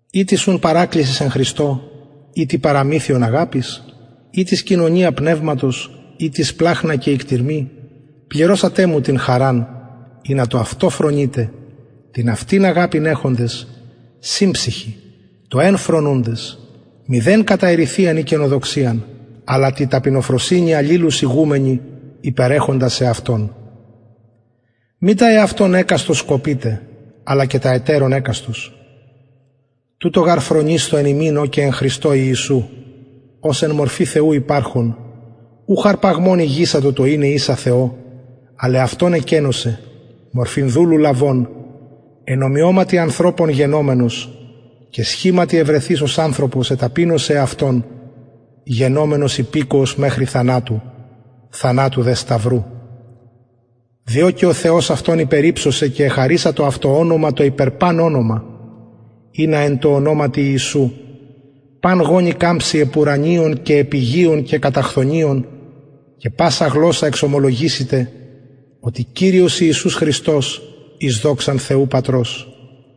ει τις ουν παρακλησις εν χριστω ει τι παραμυθιον αγαπης ει τις κοινωνια πνευματος ει τις σπλαγχνα και οικτιρμοι πληρωσατε μου την χαραν ινα το αυτο φρονητε την αυτην αγαπην εχοντες συμψυχοι το εν φρονουντες μηδεν κατα εριθειαν η κενοδοξιαν αλλα τη ταπεινοφροσυνη αλληλους ηγουμενοι υπερεχοντας εαυτων μη τα εαυτων εκαστος σκοπειτε αλλα και τα ετερων εκαστος τουτο γαρ φρονεισθω εν υμιν ο και εν χριστω ιησου ος εν μορφη θεου υπαρχων ουχ αρπαγμον ηγησατο το ειναι ισα θεω αλλ εαυτον εκενωσεν μορφην δουλου λαβων εν ομοιωματι ανθρωπων γενομενος και σχηματι ευρεθεις ως ανθρωπος εταπεινωσεν εαυτον γενομενος υπηκοος μεχρι θανατου θανατου δε σταυρου διο και ο θεος αυτον υπερυψωσεν και εχαρισατο αυτω ονομα το υπερ παν ονομα ινα εν τω ονοματι ιησου παν γονυ καμψη επουρανιων και επιγειων και καταχθονιων και πασα γλωσσα εξομολογησηται οτι κυριος ιησους χριστος εις δοξαν θεου πατρος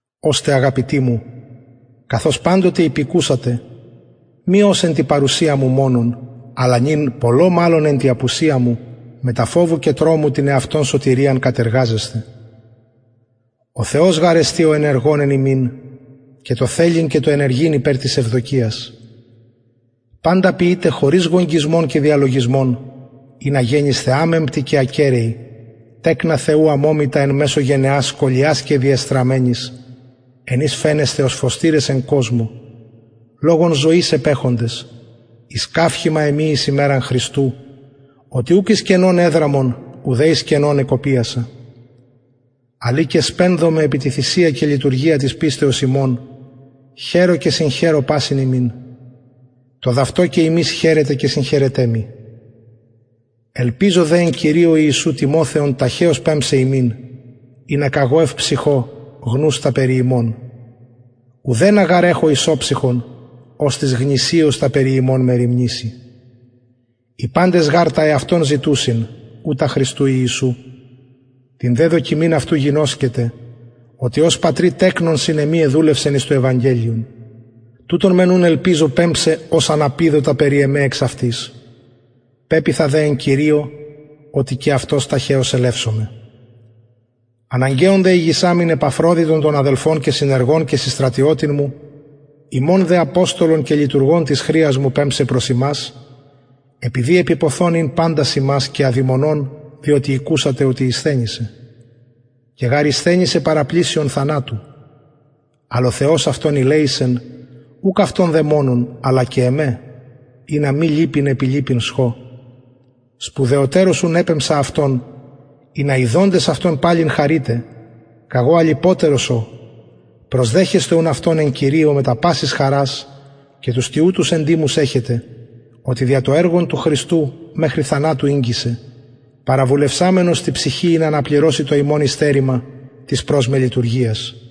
ωστε αγαπητοι μου καθως παντοτε υπηκουσατε μη ως εν τη παρουσια μου μονον αλλα νυν πολλω μαλλον εν τη απουσια μου μετα φοβου και τρομου την εαυτων σωτηριαν κατεργαζεσθε ο θεος γαρ εστιν ο ενεργων εν υμιν και το θελειν και το ενεργειν υπερ της ευδοκιας παντα ποιειτε χωρις γογγυσμων και διαλογισμων ινα γενησθε αμεμπτοι και ακεραιοι τεκνα θεου αμωμητα εν μεσω γενεας σκολιας και διεστραμμενης εν οις φαινεσθε ως φωστηρες εν κοσμω λογον ζωης επεχοντες εις καυχημα εμοι εις ημεραν χριστου οτι ουκ εις κενον εδραμον ουδε εις κενον εκοπιασα αλλ ει και σπενδομαι επι τη θυσια και λειτουργια της πιστεως υμων χαιρω και συγχαιρω πασιν υμιν το δ αυτο και υμεις χαιρετε και συγχαιρετε μοι ελπιζω δε εν κυριω ιησου τιμοθεον ταχεως πεμψαι υμιν ινα καγω ευψυχω γνους τα περι υμων ουδενα γαρ εχω ισοψυχον οστις γνησιως τα περι υμων μεριμνησει οι παντες γαρ τα εαυτων ζητουσιν ου τα χριστου ιησου την δε δοκιμην αυτου γινωσκετε οτι ως πατρι τεκνον συν εμοι εδουλευσεν εις το ευαγγελιον τουτον μεν ουν ελπιζω πεμψαι ως αν απιδω τα περι εμε εξαυτης πεποιθα δε εν κυριω οτι και αυτος ταχεως ελευσομαι αναγκαιον δε ηγησαμην επαφροδιτον τον αδελφον και συνεργον και συστρατιωτην μου υμων δε αποστολον και λειτουργον της χρειας μου πεμψαι προς υμας επειδη επιποθων ην παντας υμας και αδημονων διοτι ηκουσατε οτι ησθενησεν και γαρ ησθενησεν παραπλησιον θανατω αλλα ο θεος αυτον ηλεησεν ουκ αυτον δε μονον αλλα και εμε ινα μη λυπην επι λυπην σχω σπουδαιοτερως ουν επεμψα αυτον ινα ιδοντες αυτον παλιν χαρητε καγω αλυποτερος ω προσδεχεσθε ουν αυτον εν κυριω μετα πασης χαρας και τους τοιουτους εντιμους εχετε οτι δια το εργον του χριστου μεχρι θανατου ηγγισεν παραβουλευσαμενος τη ψυχη ινα αναπληρωση το υμων υστερημα της προς με λειτουργιας